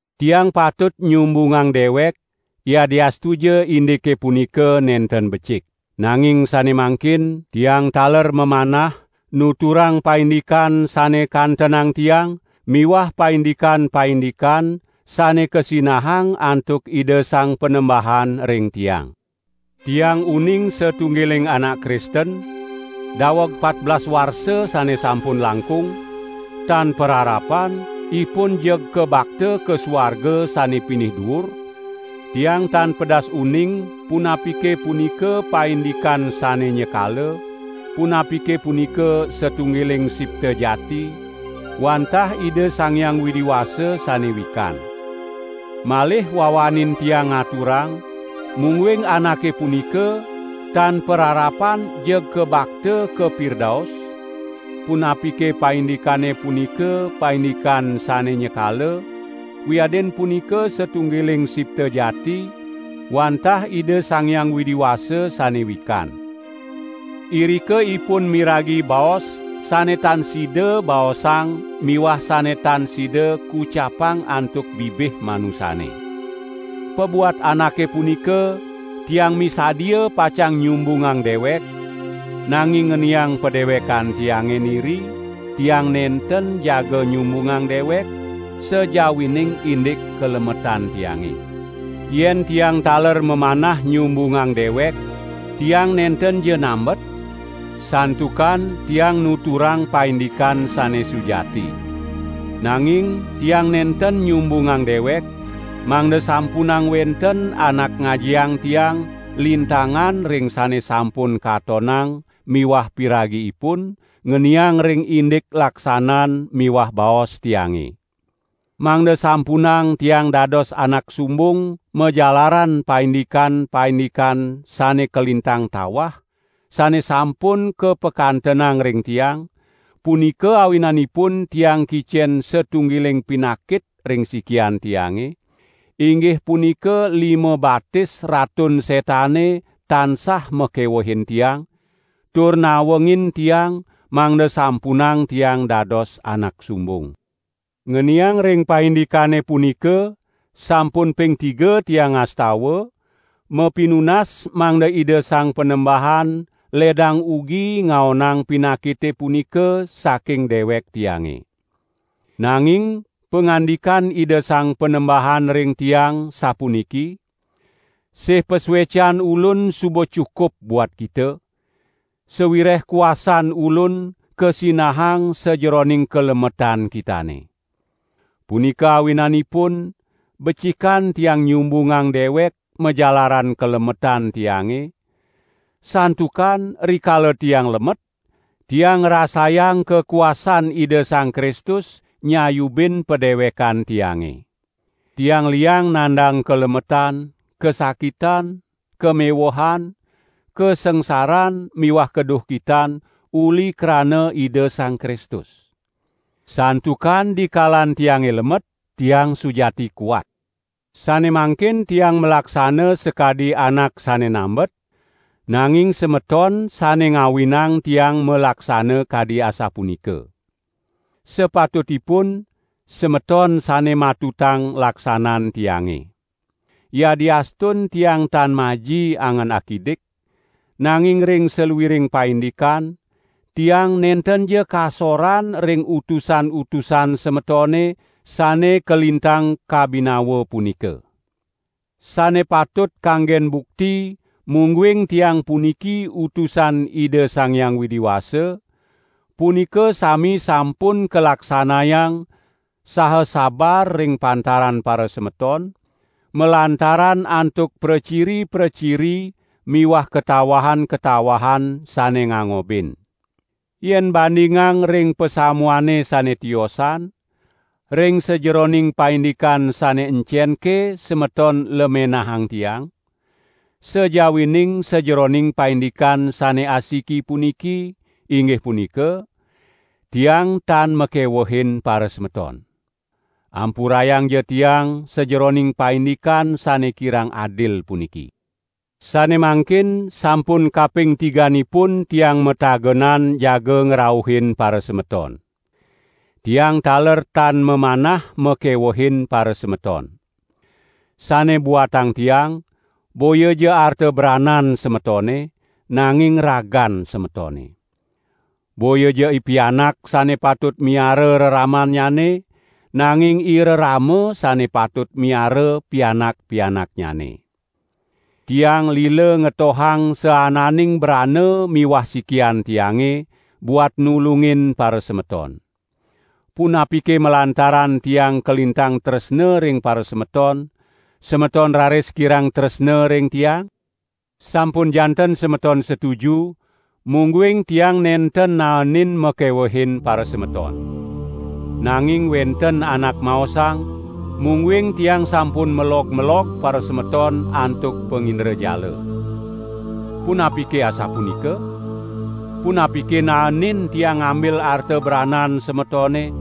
Tiang patut nyumbungang dewek, yadiastuja indike punika nenten becik. Nanging sane mangkin, tiang taler mamanah nuturang paindikan sane kantenang tiang miwah paindikan-paindikan sane kasinahang antuk Ida Sang Panembahan ring tiang. Tiang uning satunggiling anak Kristen, daweg patbelas warsa sane sampun langkung, tan pararapan ipun jeg kabakta ka suarga sane pinih duur (tiang tan pedas uning punapike punika paindikan sane nyekala, punapike punika satunggiling sipta jati, wantah Ida Sang Hyang Widi Wasa sane wikan). Malih wawanin tiang ngaturang mungguing anake punika, tan pararapan jeg kabakta ka Pirdaus (punapike paindikane punika paindikan sane nyekala wiadin punika satunggiling sipta jati wantah Ida Sang Hyang Widi Wasa sane wikan). Irika ipun miragi baos sane tan sida baosang miwah sane tan sida kucapang antuk bibih manusane. Pabuat anake punika tiang misadia pacang nyumbungang dewek, nanging ngeniang padewekan tiange niri, tiang nenten jaga nyumbungang dewek, sajawining indik kalemetan tiange. Yen tiang taler mamanah nyumbungang dewek tiang nentenja nambet, santukan tiang nuturang paindikan sane sujati. Nanging tiang nenten nyumbungang dewek, mangda sampunang wenten anak ngajiang tiang lintangan ring sane sampun katonang miwah piragi ipun ngeniang ring indik laksanan miwah baos tiange. Mangda sampunang tiang dados anak sumbung majalaran paindikan-paindikan sane kalintang tawah sane sampun kapakantenang ring tiang, punika awinanipun tiang kicen satunggiling pinakit ring sikian tiange, inggih punika lima-batis Ratun Setane tansah makewehin tiang, tur nawengin tiang mangda sampunang tiang dados anak sumbung. Ngeniang ring paindikane punika sampun ping tiga tiang ngastawa, mapinunas mangda Ida Sang Panembahan ledang ugi ngaonang pinakite punika saking dewek tiange. Nanging pangandikan Ida Sang Panembahan ring tiang sapuniki: "Sih pasuecan Ulun suba cukup buat kita, sawireh kuasan Ulun kasinahang sajeroning kalemetan kitane." Punika awinanipun becikan tiang nyumbungang dewek majalaran kalemetan tiange, santukan rikala tiang lemet, tiang ngrasayang kakuasan Ida Sang Kristus nyayubin padewekan tiange. Tiang liang nandang kalemetan, kasakitan, kamewehan, kasangsaran miwah kaduhkitan uli krana Ida Sang Kristus. Santukan dikalan tiange lemet, tiang sujati kuat. Sane mangkin tiang malaksana sakadi anak sane nambet, nanging semeton sane ngawinang tiang malaksana kadi asapunika. Sapatutipun, semeton sane matutang laksanan tiange. Yadiastun tiang tan maji angan akidik, nanging ring saluiring paindikan, tiang nentenja kasoran ring "utusan-utusan" semetone sane kalintang kabinawa punika. Sane patut kanggen bukti mungguing tiang puniki utusan Ida Sang Hyang Widi Wasa, punika sami sampun kalaksanayang saha sabar ring pantaran parasemeton, malantaran antuk praciri-praciri miwah katawahan-katawahan sane ngangobin. Yen bandingang ring pasamuane sane tiosan, ring sajeroning paindikan sane encenke semeton lemenahang tiang, sajawining sajeroning paindikan sane asiki puniki, inggih punika: Tiang tan makewehin parasemeton. Ampurayangja tiang sajeroning paindikan sane kirang adil puniki. Sane mangkin sampun kaping tiganipun tiang matagenan jaga ngrauhin parasemeton. Tiang taler tan mamanah makewehin parasemeton. Sane buatang tiang, boyaja arta branan semetone, nanging ragan semetone. Boyaja ipianak sane patut miara reramannyane, nanging irerama sane patut miara pianak-pianaknyane. Tiang lila ngetohang saananing brana miwah sikian tiange, buat nulungin parasemeton. Punapike malantaran tiang kalintang tresna ring parasemeton, semeton raris kirang tresna ring tiang? Sampun janten semeton setuju, mungguing tiang nenten naenin makewehin parasemeton. Nanging wenten anak maosang, mungguing tiang sampun melog-melog parasemeton antuk pangindrajala. Punapike asapunika? Punapike naenin tiang ngambil arta branan semetone,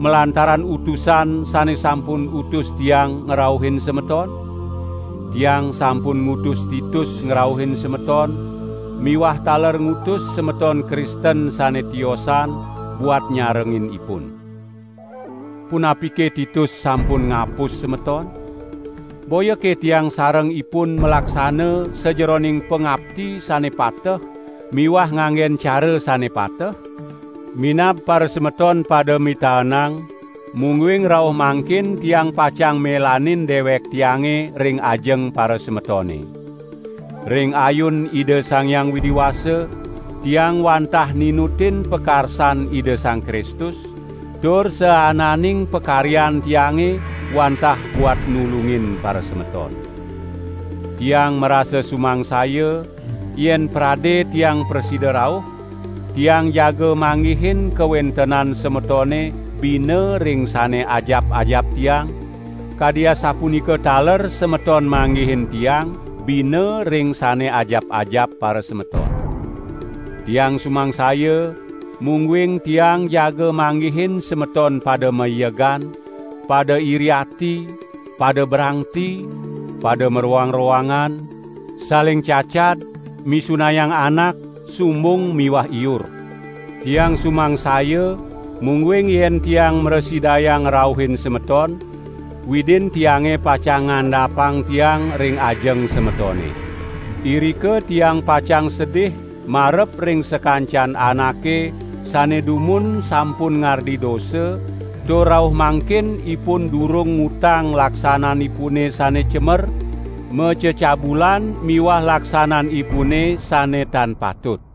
malantaran utusan sane sampun utus tiang ngrauhin semeton? Tiang sampun ngutus Titus ngrauhin semeton miwah taler ngutus semeton Kristen sane tiosan buat nyarengin ipun. Punapike Titus sampun ngapus semeton? Boyake tiang sareng ipun malaksana sajeroning pangapti sane pateh miwah nganggen cara sane pateh? Minab parasemeton pada mitaenang, mungguing rauh mangkin tiang pacang melanin dewek tiange ring ajeng parasemetone. Ring ayun Ida Sang Hyang Widi Wasa, tiang wantah ninutin pakarsan Ida Sang Kristus, tur saananing pakaryan tiange wantah buat nulungin parasemeton. Tiang marasa sumangsaya, yen prade tiang prasida rauh, tiang jaga manggihin kawentenan semetone bina ring sane ajap-ajap tiang, kadi asapunika taler semeton manggihin tiang bina ring sane ajap-ajap parasemeton. Tiang sumangsaya mungguing tiang jaga manggihin semeton pada maiegan, pada iri ati, pada brangti, pada maroang-roangan, saling cacad, misunayang anak, sumbung miwah iur. Tiang sumangsaya mungguing yen tiang mrasidayang ngrauhin semeton, Widin tiange pacang ngandapang tiang ring ajeng semetone. Irika tiang pacang sedih marep ring sakancan anake sane dumun sampun ngardi dosa tur rauh mangkin ipun durung ngutang laksananipune sane cemer, macecabulan miwah laksananipune sane tan patut.